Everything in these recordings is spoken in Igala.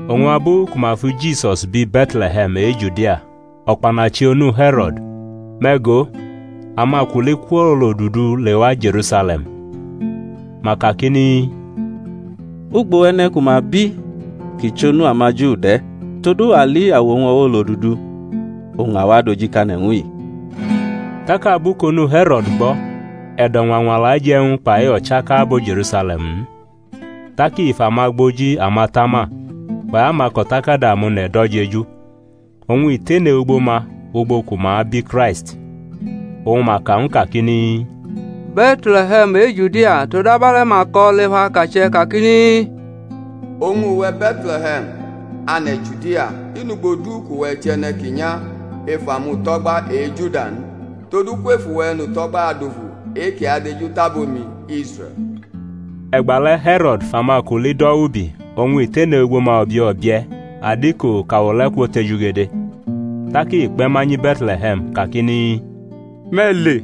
Oñ abu ku ma fi Jisus bi Be̩tle̩he̩m e-Judia o̩kpanachi onu He̩ro̩d, me̩ go, amakuli kwʼolodudu lewa Je̩rusale̩m, ma kakini, Ugbo e̩ne̩ ku ma bi kʼi chʼonu amaJu de̩? todu a li awo-wñ o̩wo̩ olodudu oñ a wa adojikane̩ ñw u-i. Tak abu kʼonu He̩ro̩d gbo̩, e̩do̩ ñwañwala je̩ ñw u kpai o̩chaka abo Je̩rusale̩m-i n. Tak i fʼamagboji amatama kpai amako̩takada amone̩ do̩ jeju, oñ i tene ugbo ma ugbo ku ma abi Kraisti. Oñ ma ka ñw u kakini, Be̩tle̩he̩m e-Judia; todu abe̩le̩ ma ko̩ lef akache̩ kakini, Oñ uwe̩ Be̩tle̩he̩m, ane̩ Judia, i nʼugbo du kʼuwe̩ chʼe̩ne̩ ki nya ef amuto̩gba e-Juda n, todu kwef uwe̩ E̩nuto̩gba adufu e-kʼi adejutʼabo-mi, Israe̩l. E̩gbale̩ He̩ro̩d fʼamakuli do̩ wʼubi oñ i tene ugbo ma o̩bie̩ o̩bie̩ adiko kʼawo le̩ kwotejugede. Tak i kpe̩ ma nyi Be̩tle̩he̩m kakini, Me̩ le,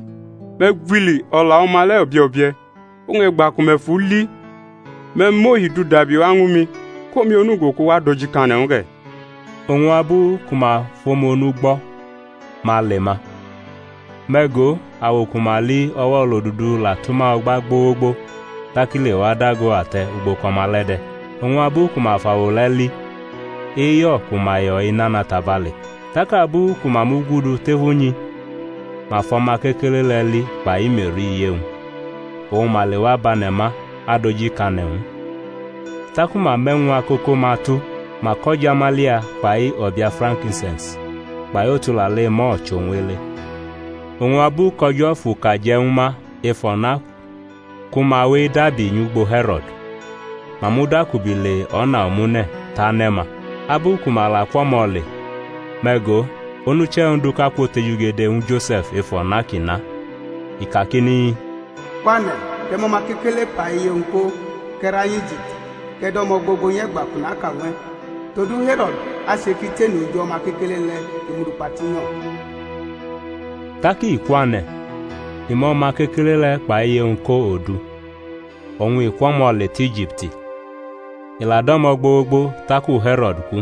me̩ gwili o̩la o̩ma le̩ o̩bie̩ o̩bie̩. Oñ e̩gba ku me̩ fʼu li me̩ mʼohi-wñ du dabi wa ñwu mi, kʼomi onugo kʼu wa adojikane̩ ñw u ge̩. Oñ abu ku ma fʼomu onu gbo̩ ma le ma; me̩ go, awo ku ma li o̩wo̩ olodudu la tʼuma o̩gba gbogbo tak i lewa dago ate̩ ugbo kʼo̩ma le̩ de̩. Oñ abu ku ma fʼawo le̩ li, eyo̩ ku ma yo̩ i nana tabale̩. Tak abu ku ma mugudu tef unyi ma fʼo̩ma kekele le̩ li kpai Me̩ri, iye-wñ, oñ ma lewa bʼane̩ ma adojikane̩ ñw u. Taku ma mʼe̩wñ akoko-ma tu, ma kʼo̩jamalia, kpai o̩bia frankinse̩ns kpai otulale mur chʼowñ ele. Oñ abu kʼO̩jo̩ fʼuka je̩ ñwu ma ef o̩na ku ma we edabi nyʼugbo He̩ro̩d, ma mudakubi le o̩na omune̩ tʼane̩-ma. Abu ku ma la kwʼo̩mo̩ le, me̩ go, onuche̩ Onduʼka kwotejugede ñwu lose̩f ef o̩na kʼi na, i kakini, Kwane̩, kʼe̩ mʼo̩ma kekele kpai iye-wñ ko kʼe̩ ra nyʼIjipti, kʼe̩ dʼo̩mo̩ gbogbo nyʼe̩gba kʼu naka ñw e̩; todu He̩ro̩d ache kʼi tene oji o̩ma kekele le̩ kʼi mʼu du kpa tinyo̩. Tak i kwane̩, i mʼo̩ma kekele le̩ kpai iye-wñ ko odu, oñ i kwʼo̩mo̩ le tʼIjipti, i la dʼo̩mo̩ gbogbo taku He̩ro̩d ku;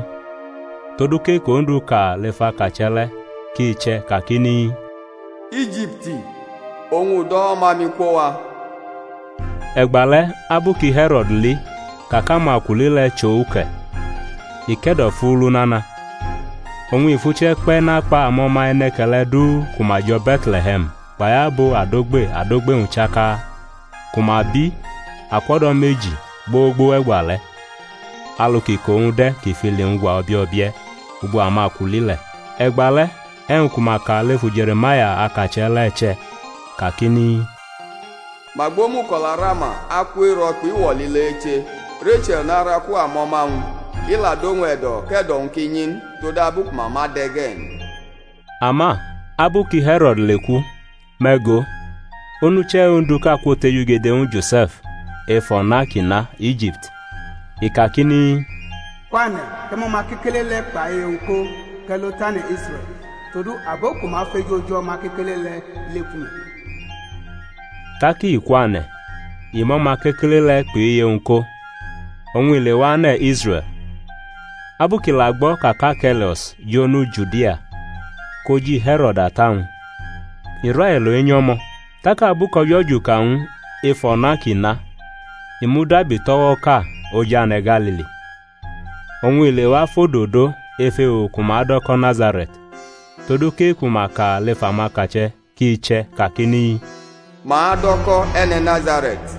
todu kʼe-kʼOndu ka lef akache̩ le̩ ki che̩ kakini, Ijipti oñ u do̩ O̩ma-mi kwo wa. E̩gbale̩ abu ki He̩ro̩d li ka kʼamakuli le̩ chʼo uke̩, i ke̩do̩fulu nana, oñ i fʼuche̩ kpe̩ nakpa amo̩ma e̩ne̩ke̩le̩ du ku ma jo̩ Be̩tle̩he̩m kpai abo adogbe adogbe-wñ chaka, ku ma bi akwʼo̩do̩ meji gbogbo wʼe̩gbale̩, alu kʼiko-wñ de̩ kʼi fʼili-wñ gwa obie̩ ugbo amakuli le̩. E̩gbale̩ e̩wñ ku ma ka lefu Je̩re̩maya, akache̩, le̩, che̩ kakini, Ma gbʼomuko̩la Rama, aku ero̩ kpʼiwo̩ lile eche, Reche̩l naraku amo̩ma-wñ; i la dʼowñ e̩do̩ kʼe̩do̩-wñ ki nyi n, todabu ku ma ma de̩ ge̩ n. Ama abu ki He̩ro̩d leku, me̩ go, onuche̩ Onduʼka kwotejugede ñwu Jose̩f ef o̩na kʼi na Ijipti, i kakini, kwane̩, kʼe̩ mʼo̩ma kekele le̩ kpʼiye-wñ ko kʼe̩ lo tʼane̩ Israe̩l; todu abo ku ma feju oji o̩ma kekele le̩ leku me̩. Tak i kwane̩, i mʼo̩ma kekele le̩ kpʼiye-wñ ko, oñ i lewa ane̩ Israe̩l. Abu kʼi la gbo̩ ka kʼArke̩laus jʼonu Judia koji He̩ro̩d ata-wñ, i railo enyʼo̩mo̩. Tak abu kʼO̩jo̩ juka ñw u ef o̩na kʼi na, i mudabi tʼo̩wo̩ʼka oj ane̩ Galili. Oñ i lewa fʼodo do ef ewo ku ma do̩ ko̩ Nazare̩t, todu kʼe-ku ma ka lef amakache̩ kʼi che̩, kakini. Ma adʼo̩ ko̩ E̩ne̩ Nazare̩t.